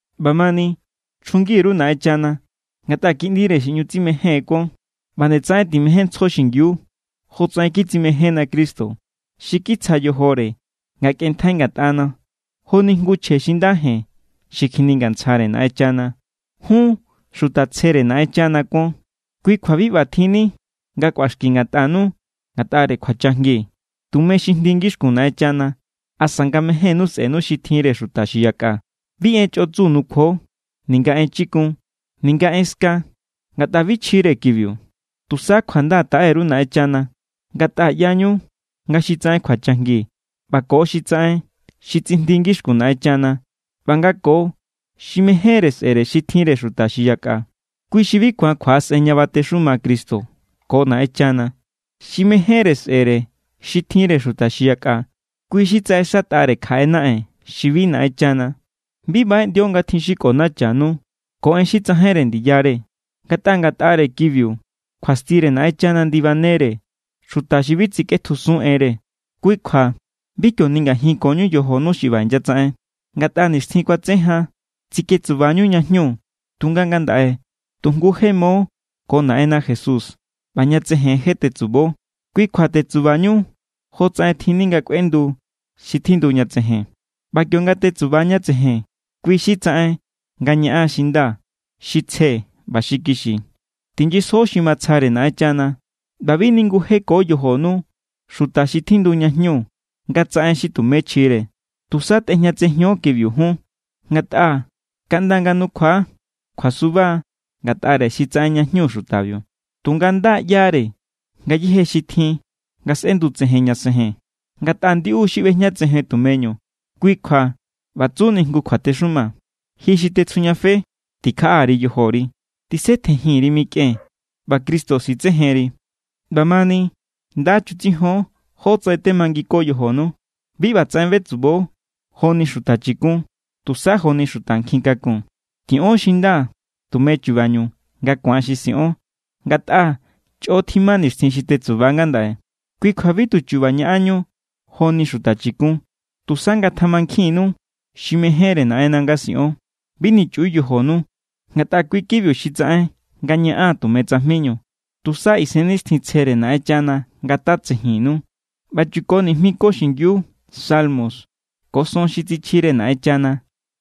ꞌBamani, chjungi_ru Naꞌenchana, ngatꞌa kiꞌndire xi ꞌñu tsimején kuon. ꞌBa nde tsaꞌen timejénntsjo xingiu jotsaꞌen kitsimejénna Cristo. Xi kitsja yojore nga kꞌenntjai ngatꞌana, joni jngu chje xi nda jen xi kjiningantsjare Naꞌenchana. Jun xuta tsjere Naꞌenchana kuon. Kui kjua bi ꞌbatjinni nga kꞌuaxki ngatꞌanu ngatꞌare kjuachajngi, tumeñu xi jndi ngixkun Naꞌenchana, asa nga mejénnu sꞌe̱nu xi tjinre xuta xi yakꞌa. Bi en xi chꞌotsu nukjuo, ninga en chikun, ninga en ska, ngatꞌa bi chjire kibiu. Tusa kjuanda taꞌe_ru Naꞌenchana. Ngatꞌa ꞌyañu nga xi tsaꞌen kjuachajngi ꞌba ko xi tsaꞌen xi tsijndi ngixkun Naꞌenchana ꞌba nga ko xi mejénre sꞌe̱re xi tjinre xuta xi yakꞌa, kui xi bi ku̱an kjuaꞌasꞌen ña batexuma Cristo ko Naꞌenchana. Xi mejénre sꞌe̱re xi tjinre xuta xi yakꞌa, kui xi tsaꞌexatꞌare kjaꞌe naꞌen xi bi Naꞌenchana. Bi baꞌeꞌndio nga tjin xi kꞌonachanu ko en xi tsajainre ndiyare, ngatꞌa ngatꞌare kibiu kjuastire Naꞌenchana ndibanere xuta xi bi tsikꞌetjusun enre. Kui kjua bi kio ningajinkoñu yojonu xi ꞌba inyatsaꞌen. Ngatꞌa nixtjin kuatse jan tsiketsuba=ñú ña jñu, tunga ngandaꞌe tu jngu je mo ko Naꞌenna Jesús ꞌba ña tsejen je tetsubo. Kui kjua tetsubañu jotsaꞌen tjinni nga kꞌuendu xi tjindu ña tsejen. ꞌBa kionga tetsuba ña tsejen, kui xi tsaꞌen nga ñaꞌan xi nda, xi tsje ꞌba xi kixi. Tinyisjo xi matsjare Naꞌenchana. ꞌBa bi ningujeko yojonu xuta xi tjindu ña jñu nga tsaꞌen xi tumé chjire. Tusa tꞌejñatsijon kibiu jun. Ngatꞌa kaꞌnda nga nukjua kjuasuba= ngatꞌare xi tsaꞌen ña jñu xutabiu. Tunga nda= ꞌyare ngayéje xi tjin nga sꞌendutsejen ña tsejen, ngatꞌa ndiꞌu= xi ꞌbejñatsejen tumeñu. Kui kjua ꞌba tsuni jngu kjuatexuma: Ji xi tetsjujñafe, tikjaꞌa_ri yojori. Tisetjenjin_ri mikꞌen, ꞌba Cristo sitsejenri. ꞌBamani, nda chutsijon jótsaꞌen temanginko yojonu. Bi ꞌbatsaꞌen betsubo joni xuta chikun, tusa joni xuta nkjin kakun. Tiꞌon xi nda tume chubañu nga ku̱an xi siꞌon, ngatꞌa chꞌo tjima nixtjin xi tetsuba ngandaꞌe. Kui kjua bi tu chu̱ba̱ ñaꞌanñu joni xuta chikun, tusa ngatjamankjinnu xi mejénre Naꞌenna nga siꞌon. Bi nichꞌiu yojonu, ngatꞌa kui kibiu xi tsaꞌen nga ñaꞌan tume tsajminu. Tusa Isennixtjintsjere Naꞌenchana ngatatsejinnu. ꞌBa chuko nijmi ko xingiu salmo ko son xi tsichjire Naꞌenchana,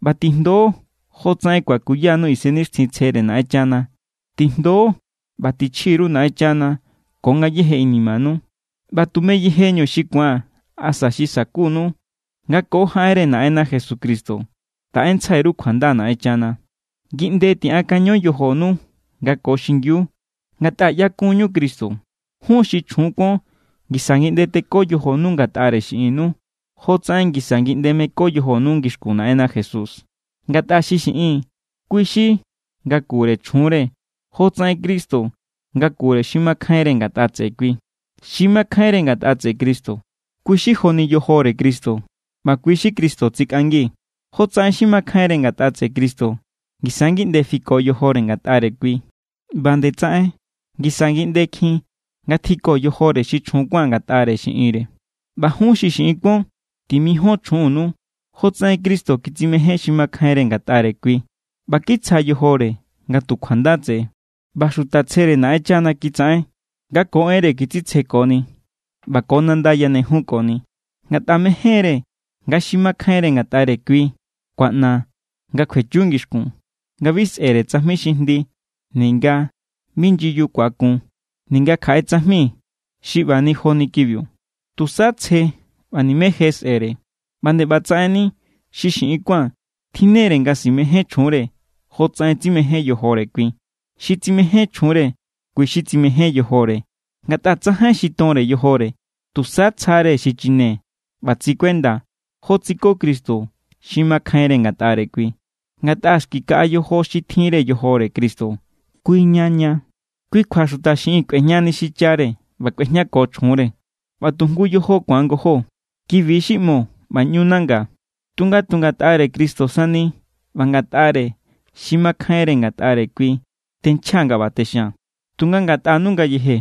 ꞌba tijndo jotsaꞌen kuakuyanu Isennixtjintsjere Naꞌenchana. Tijndo ꞌba tichji_ru Naꞌenchana ko ngayéje inimanu. ꞌBa tume yejeñu xi ku̱an asa xi sa̱kunu, nga ko jaꞌenre Naꞌenna Jesucristo taꞌentsjai_ru kjuanda Naꞌenchana. Ngi ꞌnde tiꞌankaño yojonu nga ko xingiu, ngatꞌa ꞌyakun=ñu Cristo. Jun xi chjun kuon, ngisa ngi ꞌnde teko yojonu ngatꞌare xiꞌinnu jotsaꞌen ngisa ngi ꞌnde meko yojonu ngixkun Naꞌenna Jesús. Ngatꞌa xi xiꞌin, kui= xi ngakure chjunre jotsaꞌen Cristo ngakure xi makjainre ngatꞌa tseꞌe kui. Xi makjainre ngatꞌa tseꞌe Cristo, kui= xi joni yojore Cristo ꞌba kui= xi Cristo tsikꞌangi. Jotsaꞌen xi makjainre ngatꞌa tseꞌe Cristo ngisa ngi ꞌnde fiko yojore ngatꞌare kui, ꞌba nde tsaꞌen ngisa ngi ꞌndekjin ngatjiko yojore xi chjun kuán ngatꞌare xiꞌinre. ꞌBa jun xi xiꞌin kuon, timijon chjunnu jotsaꞌen Cristo kitsimején xi makjainre ngatꞌare kui ꞌba kitsja yojore nga tu kjuanda tseꞌe. ꞌBa xuta tsjere Naꞌenchana kitsaꞌen nga ko enre kitsitsjekoni ꞌba ko nanda yanejunkoni. Ngatꞌa mejénre nga xi makjainre ngatꞌare kui kuaꞌna nga kjuechu ngixkun, nga bi sꞌe̱re tsajmi xi jndi ninga bi nyiyu ku̱akun ninga kjaꞌe tsajmi xi ꞌba ni joni kibiu, tusa tsje ꞌba nimé je sꞌe̱re. ꞌBa nde ꞌbatsaꞌenni xi xiꞌin kuán tjinnere nga simején chjunre, jotsaꞌen tsimején yojore kui. Xi tsimején chjunre, kui xi tsimején yojore. Ngatꞌa tsajain xi tonre yojore. Tusa tsjare xi chine ꞌba tsikuenda, jo tsiko Cristo xi makjainre ngatꞌare kui. Ngatꞌa xki kaꞌa yojo xi tjinre yojore Cristo, kuiña ña. “Kui kjua xuta xiꞌin kꞌuejñani xichare ꞌba kꞌuejñako chjunre, ꞌba tu jngu yojo ku̱an ngojó.” Kibi= xi ꞌmo ꞌba ꞌñu nanga. Tunga tu ngatꞌare Cristo sani ꞌba ngatꞌare xi makjainre ngatꞌare kui tenchjaa̱ nga ꞌba texia̱n. Tunga ngatꞌanu ngayeje,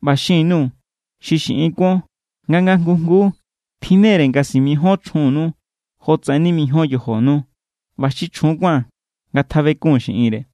ꞌba xin_nuu̱ xi xiꞌin kuon nga nga jngu jnguu tjinnere nga simijíon chjunnu jotsaꞌen nimijíon yojonu. ꞌBa xi chjun kuán, ngatjabekun xiꞌinre.